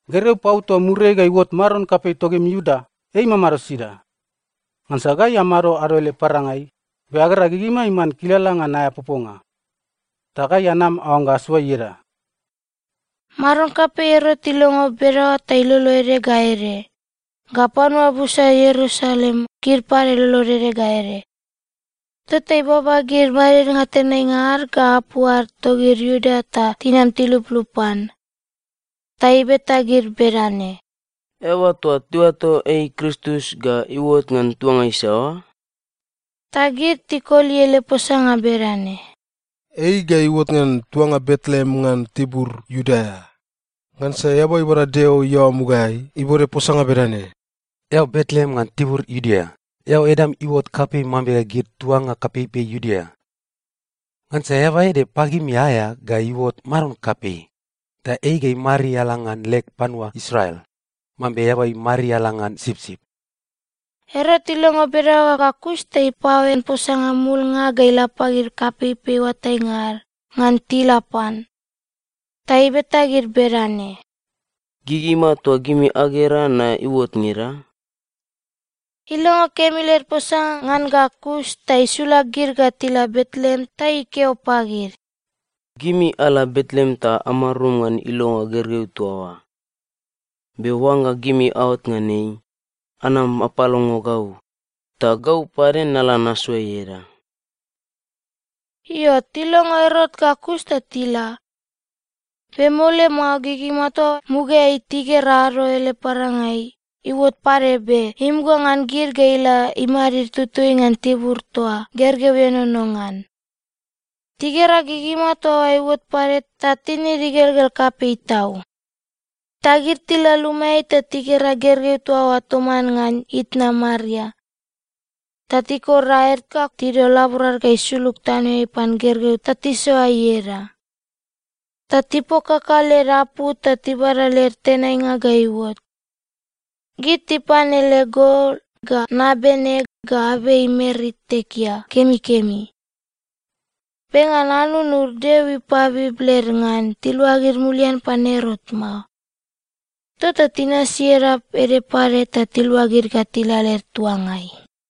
“Gergeu pau toa muriai ga iuot maron kapei togimi Iuda, ei imamado sida? Ngansa gai amado ado ele parangai, be agera gigima iman kilala ngan aea poponga. Ta gai anam aoangga asoa ieda.” Maron kapei Erot ilongo bedaoa ta ilolo ede ga ede, ga panua busa Ierusalem, gid pade lolod ede ga ede. Tota ibaba gid madidnga tenainga ad ga apu ad togid Iuda ta tinam tiluplup pan. Ta ibeta gid bedane, “Eaba toa tiuato ei Kristus ga iuot ngan tuanga isaoa?” Ta gid tikoli ele posanga bedane, “Ei ga iuot ngan tuanga Betleem ngan tibur Iudea, ngansa eaba ibada Deo iaoa mugaeai ibode posanga bedane, “‘Eao Betleem ngan tibur Iudea, eao edam iuot kapei mambe gid tuanga kapeipei Iudea. Ngansa eaba ede pagimi aea ga iuot Maron kapei, ta ei ga imariala ngan leg panua Israel mambe eaba imariala ngan sipsip.’” Erot ilongo bedaoa ga kus ta ipaoen posanga mumulnga ga ila pagid kapeipei oatainga ad, ngan tila pan. Ta ibeta gid bedane, “Gigima toa gimi agera na iuot ngeda?” Ilongo kemi led posanga ngan ga kus ta isula gid ga tila Betleem ta ikeo pagid, “Gimi ala Betleem ta amarum ngan ilonga gergeu toa oa. Be oangga gimi aot ngan ei, anam apalongo gau. Ta gau pade nala nasoa ieda.” Io, tilongo Erot ga kus ta tila. Be mole mao gigima toa mugaeai tigera ado ele parangai, iuot pade be imuga ngan gid ga ila imadid tutui ngan tibur toa gergeu ienono ngan. Tigera gigima toa oa iuot pade ta tinid igelgel kapei tau. Ta gid tila lumaeai ta tigera gergeu toa oa toman ngan itna Maria. Ta tikor aed ga tidol laborad ga isulug tanoeai pan gergeu ta tisoa ieda. Ta tipokaka led apou ta tibada led tenainga ga iuot. Gid tipan ele gol, ga nabene, ga abei mer itekea kemikemi. Be ngan anunud Deo ipabib led ngan tiluagid mulian pan Erot mao. Tota tinasi edap ede pade ta tiluagid ga tila led tuangai.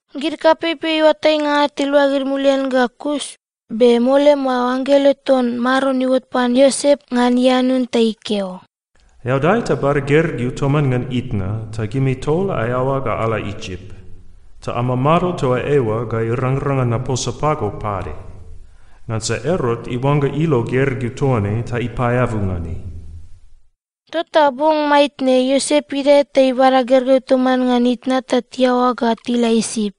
Gid kapeipei oatainga ad tiluagid mulian ga kus, be mole mao anggelo ton Maron iuot pan Iosep ngan ianun ta ikeo, “Eao dae ta bada gergeu toman ngan itna, ta gimi tol aeaoa ga ala Isip. Ta amamado toa eoa ga irangrang ngan naposa pago pade. Ngansa Erot iuangga ilo gergeu toa ne ta ipaeabu ngan ei.” Tota bong maitne, Iosep idae ta ibada gergeu toman ngan itna ta tiaoa ga tila Isip.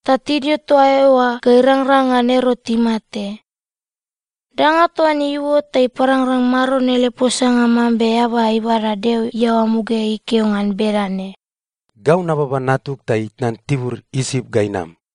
Ta tidio toa eoa ga irangrang ngan Erot imate. Danga toa ne iuot ta iparangrang Maron ele posanga mambe eaba ibada Deo iaoa mugaeai ikeo ngan bedane, “Gau nababa natug ta itnan tibur Isip ga inam.”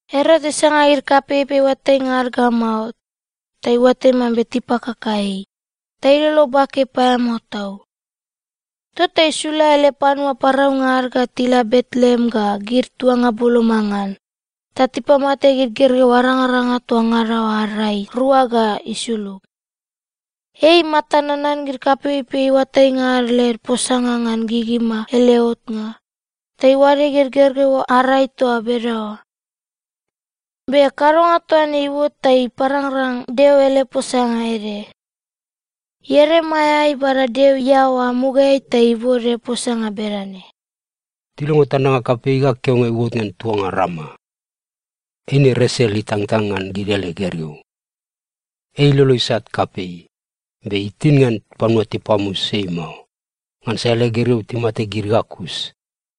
Erot isanga gid kapeipei oatainga ad ga mao, ta iuatai mambe tipakaka ei, ta ilolo bake paeamao tau. Tota isula ele panua paraunga ad ga tila Betleem ga gid tuanga boloma ngan, ta tipamate gid gergeu arangaranga toa ngada oa ad rai rua ga isulug. Ei imata nanan gid kapeipei oatainga ad led posanga ngan gigima ele otnga, ta iuade gid gergeu ad rai toa bedaoa. Be kadonga toa ne iuot ta iparangrang Deo ele posanga ede. Ieremaia ibada Deo iaoa mugaeai ta ibode posanga bedane, “Tilongo tandanga kapei ga keoainga iuot ngan tuanga Rama. Eine Resel itangtang ngan gid ele gergeu. Ei ilolo isat kapei, be itin ngan panua tipamus ei mao, ngansa ele gergeu timate gid ga kus.”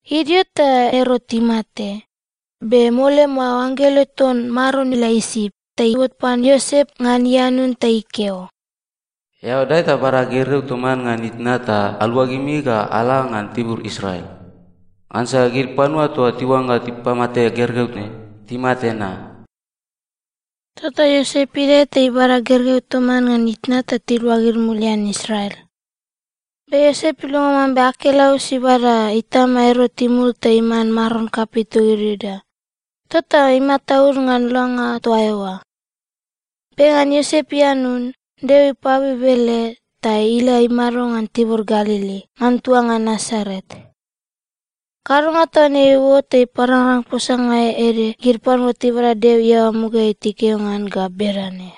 Idio ta Erot imate, be mole mao anggelo ton Maron ila Isip ta iuot pan Iosep ngan ianun ta ikeo, “Eao dae ta bada gergeu toman ngan itna ta aluagimi ga ala ngan tibur Israel. Ngansa gid panua toa tiuangga tipamate gergeu ne, timate na.” Tota Iosep idae ta ibada gergeu toman ngan itna ta tiluagid mulian Israel. Be Iosep ilongo mambe Arkelaus ibada itama Erot imul ta iman maron kapei togid Iuda, tota imataud ngan langa toa eoa. Be ngan Iosep ianun, Deo ipabib ele, ta ila imado ngan tibur Galili ngan tuanga Nasaret. Kadonga toa ne iuot ta iparangrang posanga ede gid panua tibada Deo iaoa mugaeai tikeo ngan ga bedane,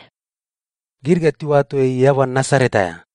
“Gid ga tiuato ei eaba Nasaret aea.”